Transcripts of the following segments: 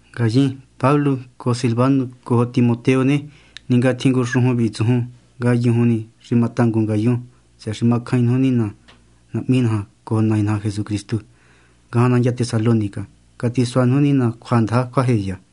Ngayin, Pablo cojo Silvanu cojo Timoteo ne, ningatjin ngu xujun vi tsujun, ngayujun ni xi matangun ngayun tsëhë xi macjain nuju Nina Nahmi naja cojo Nai naja Jesucristu, ngajan nandya Tesalónica. Catisua nuju Nina cjuandaja cjuajeya.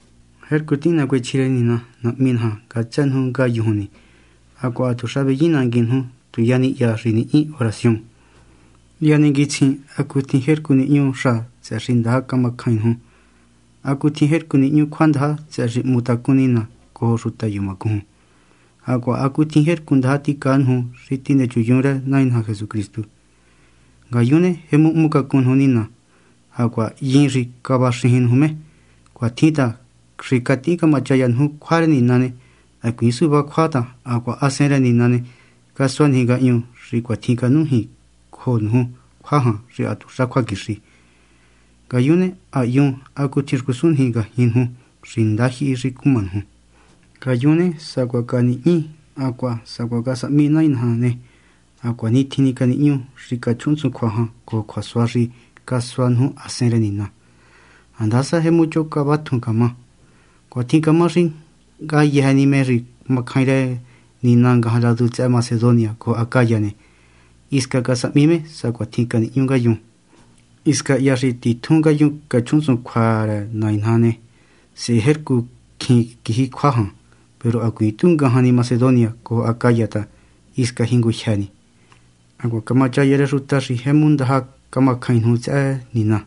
Jercu tihin nacuechji rë Nina Nahmi naja ngatsë nuju ngayujun ni, hacuaha hatuxa veyinnanguin nuju tu ya ni hya xi nihñi oración. Hya ninguitsjin hacutjin jercu nihñu xa tsëhë xi ndaja macjain nuju, hacutjin jercu nihñu cjuandaja tsëhë xi hmu tacún Nina cojo xuta yumacujun, hacuaha hacutjin jercu ndaja ticaa nuju xi tinechunyun rë Nai naja Jesucristu. Ngayun ne, jemu hmucacun nuju Nina, hacuaha hyin xi cavaxijin nuju me. Cuatjin ta xi catihin camachaya nuju cjua rë Nina ne, hacuiin suvá cjua ta hacuaha Hasen rë Nina ne, casua niji ngahñu xi cuatjin canújin cojo nuju cjua jan xi hatuxa cjuaquixi. Ngayun ne, ha hyun hacutjin xcusun niji ngajñi nuju, xi ndajyihi xi cuma nuju. Ngayun ne, sacuaha canihñi hacuaha sacuaha casahmi Nai naja ne, ha cuanitjin ni canihñú xi cachjuhunntsun cjua jan cojo cjuasua xi casua nuju Hasen rë Nina, handasa jemu choho cavatjun camá. Cuatjin camá xi ngayëjë ni me xi macjain rë Nina ngajan ladu tsëhë Macedonia cojo Acaya ne, hisca casahmi me sacuatjin canihñú ngayun. Hisca hya xi titjun ngayun cachjuhunntsun cjua rë Nai naja ne, sehe jercu cjin quiji cjua jan, peru hacuiin tu ngajan ni Macedonia cojo Acaya ta hisca jingujyë ni. Hacuaha camachaya rë xuta xi jemu ndaja camacjain nuju tsëhë Nina.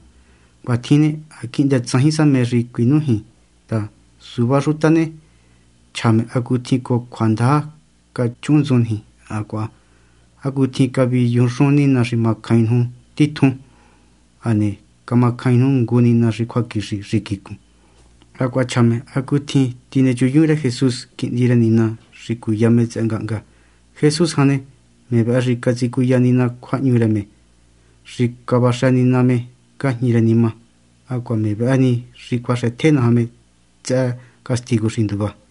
Cuatjin ne, ha quihndë tsajin sa mé xi cuinújin ta suvá xuta ne, chja me hacutjin cojo cjuandaja cachjuhunntsun niji hacuaha hacutjin caviyujunxun nina xi macjain nuju titjun, hane camacjain nuju ngu Nina xi cjuaquixi xi quicun. Hacuaha chja me hacutjin tinechunyun rë Jesús, Quihndi rë Nina, xi cuya me tsëhë ngahnga. Jesús jan ne, me vëhë xi catsicuya Nina cjuahñu rë me xi cavaxë Nina me ngajñi rë nima, hacuaha me vëhë ni xi cuaxëtje naja me tsëhë castigu xi nduva.